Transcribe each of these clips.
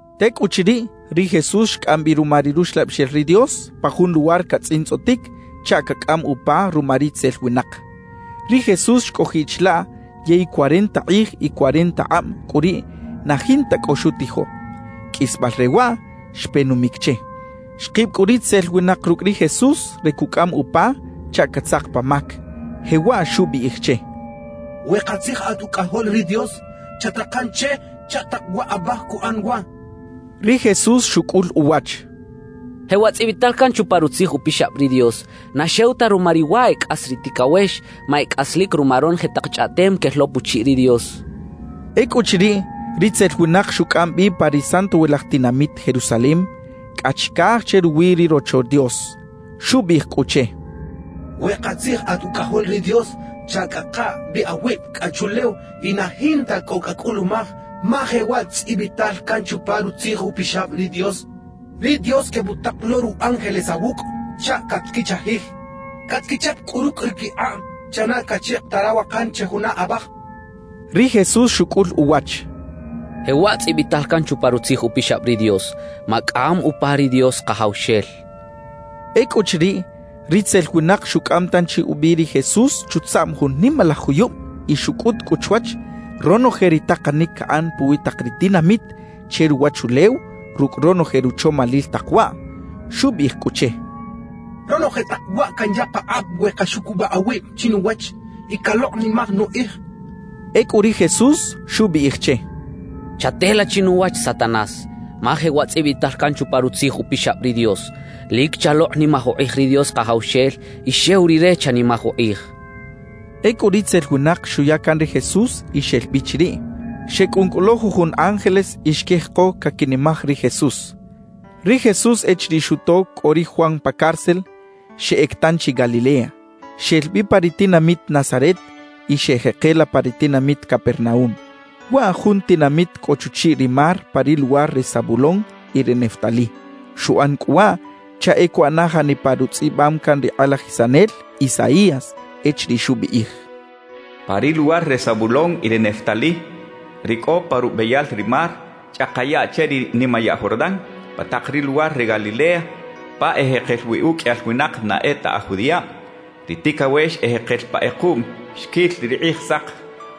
Tecꞌuchiriꞌ, ri Jesús xcꞌam bi ruma ri Ruxlabixel ri Dios pa jun luwar catzꞌintzꞌotic chaꞌ cacꞌam upa ruma ritzel winak. Ri Jesús xcꞌojiꞌ chilaꞌ yey cuarenta kꞌij y cuarenta akꞌab cꞌu riꞌ na jinta cꞌo xutijo. Qꞌuisbal re waꞌ xpe numic che. Xkib cꞌu ritzel winak rucꞌ ri Jesús re cucꞌam upa chaꞌ catzak pa mac, jewaꞌ xubiꞌij che: —We katzij at Ucꞌajol ri Dios, chat-takan che chaꞌ tak waꞌbaj cuꞌan wa —xchaꞌ. Ri Jesús xucꞌul uwach: —Jewaꞌ tzꞌibital can chupa Rutzij Upixab ri Dios: Na xew ta ruma ri wa e cꞌas ri ticawex, ma e cꞌaslic ruma ronoje tak chꞌaꞌtem quel lo puchiꞌ ri Dios —xchaꞌ. Ecꞌuchiriꞌ, ritzel winak xucꞌam bi pa ri santowilaj tinamit Jerusalem cꞌa chicaj che ruwi ri Rocho Dios. Xubiꞌij cꞌu che: —We katzij at Ucꞌajol ri Dios, chacꞌaka bi awib cꞌa chuꞌlew y na jinta cꞌo cacꞌulumaj, ma jewaꞌ tzꞌibital can chupa Rutzij Upixab ri Dios: Ri Dios quebutak lo ru ángeles awucꞌ chaꞌ catquichajij. Catquichap cꞌu rucꞌ ri quikꞌab chaꞌ na caꞌchika ta rawakan che juna abaj —xchaꞌ. Ri Jesús xucꞌul uwach: —Jewaꞌ tzꞌibital can chupa Rutzij Upixab ri Dios: Macꞌam upa ri Dios Kajawxel —xchaꞌ. Ecꞌuchiriꞌ, ritzel winak xucꞌam tanchi ubi ri Jesús chutzaꞌm jun nimalaj juyub y xucꞌut cꞌu chwach, ronoje ri takanic caꞌan puwi tak ri tinamit che ruwachulew rucꞌ ronoje ruchomalil tak waꞌ. Xubiꞌij cꞌu che: —Ronoje tak waꞌ canya pakꞌab we caxucubaꞌ awib chinuwach y calokꞌnimaj nukꞌij —xchaꞌ. Ecꞌu ri Jesús xubiꞌij che: —Chatela chinuwach Satanás, ma jewaꞌ tzꞌibital can chupa Rutzij Upixab ri Dios: Lic chalokꞌnimaj ukꞌij ri Dios Kajawxel y xew Rire chanimaj ukꞌij —xchaꞌ. Ecꞌu ritzel winak xuya can ri Jesús y xel bi chiriꞌ. Xecꞌun cꞌu lo jujun ángeles y xquijeko caquinimaj ri Jesús. Ri Jesús, echiriꞌ xuto cꞌo ri Juan pa cárcel, xeꞌec tanchi Galilea. Xel bi pa ri tinamit Nazaret y xeꞌjekela pa ri tinamit Capernaúm. Waꞌ jun tinamit cꞌo chuchiꞌ ri mar pa ri luwar re Zabulón y re Neftalí. Xuꞌan cꞌu waꞌ chaꞌ e cuꞌana janipa rutzꞌibam can ri kꞌalajisanel Isaías echiriꞌ xubiꞌij: Pa ri luwar re Zabulón y re Neftalí, ri cꞌo pa rubeyal ri mar, chꞌaka yaꞌ che ri nimayaꞌ Jordán, pa tak ri luwar re Galilea pa ejekel wi uqꞌuiyal winak na e ta aj judiꞌab; ri ticawex ejekel pa kꞌekuꞌm xquil ri Kꞌijsak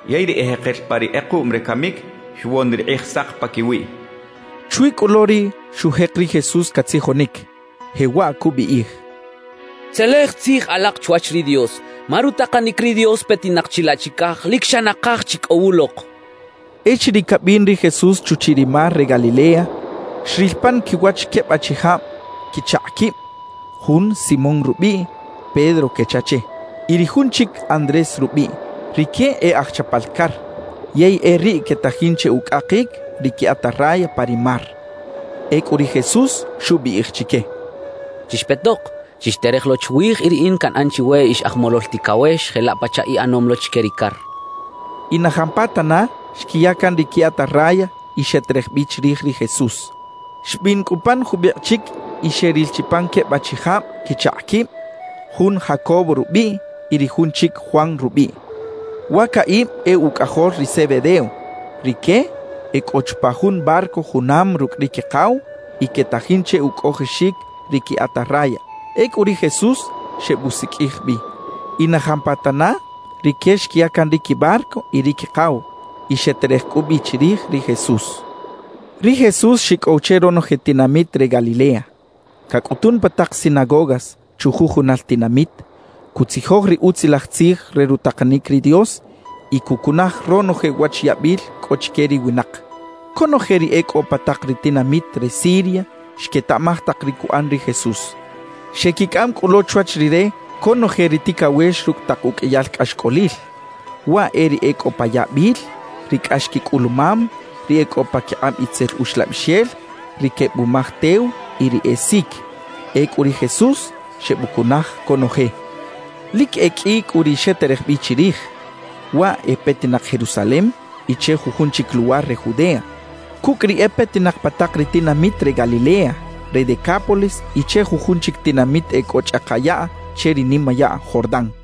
yey ri ejekel pa ri kꞌekuꞌm re camic, xwon ri Kꞌijsak paquiwiꞌ xchaꞌ. Chwi cꞌu lo riꞌ xujek ri Jesús catzijonic, jewaꞌ cubiꞌij: «Tzelej tzij alak chwach ri Dios, ma rutakanic ri Dios petinak chilaꞌ chicaj lic xa nakaj chi cꞌo wulok» cachaꞌ. Echiriꞌ cabin ri Jesús chuchiꞌ ri mar re Galilea, xril pan quiwach queb achijab quichakꞌ quib, jun Simón rubiꞌ (Pedro quecha che) y ri jun chic Andrés rubiꞌ. Rique e aj chapal car, yey e riꞌ quetajin che ucꞌakic ri qui atarraya pa ri mar. Ecꞌu ri Jesús xubiꞌij chique: —Chixpetok, chixterej lo chwij, y riꞌin canꞌan chiwe ix aj molol ticawex, jelaꞌ pachaꞌ iꞌanom lo chique ri car —xcha chique. Y na jampatana xquiya can ri qui atarraya y xeterej bi chirij ri Jesús. Xbin cꞌu pan jubikꞌ chic y xeril chi pan queb achijab quichakꞌ quib, jun Jacobo rubiꞌ y ri jun chic Juan rubiꞌ. Wa caꞌib e ucꞌajol ri Zebedeo. Rique e cꞌo chupa jun barco junam rucꞌ ri quikaw y quetajin che ucꞌojoxic ri qui atarraya. Ecꞌu ri Jesús xebusiqꞌuij bi. Y na jampatana rique xquiya can ri quibarco y ri quikaw, y xeterej cꞌu bi chirij ri Jesús. Ri Jesús xicꞌow che ronoje tinamit re Galilea. Cacꞌutun pa tak sinagogas chujujunal tinamit, cutzijoj ri Utzilaj Tzij re rutakanic ri Dios y cucunaj ronoje uwach yabil cꞌo chique ri winak. Conoje ri e cꞌo pa tak ri tinamit re Siria xquetaꞌmaj tak ri cuꞌan ri Jesús. Xequicꞌam cꞌu lo chwach Rire conoje ri ticawex rucꞌ tak uqꞌuiyal cꞌaxcꞌolil. Waꞌ e ri e cꞌo pa yabil, ri cꞌax quicꞌulumam, ri e cꞌo paquikꞌab itzel uxlabixel, ri quebumaj tew y ri e sic. Ecꞌu ri Jesús xebucunaj conoje. Lic e qꞌui cꞌu ri xeterej bi chirij. Waꞌ e petinak Jerusalem y che jujun chic luwar re Judea, cucꞌ ri e petinak pa tak ri tinamit re Galilea, re Decápolis y che jujun chic tinamit e cꞌo chꞌaka yaꞌ che ri nimayaꞌ Jordán.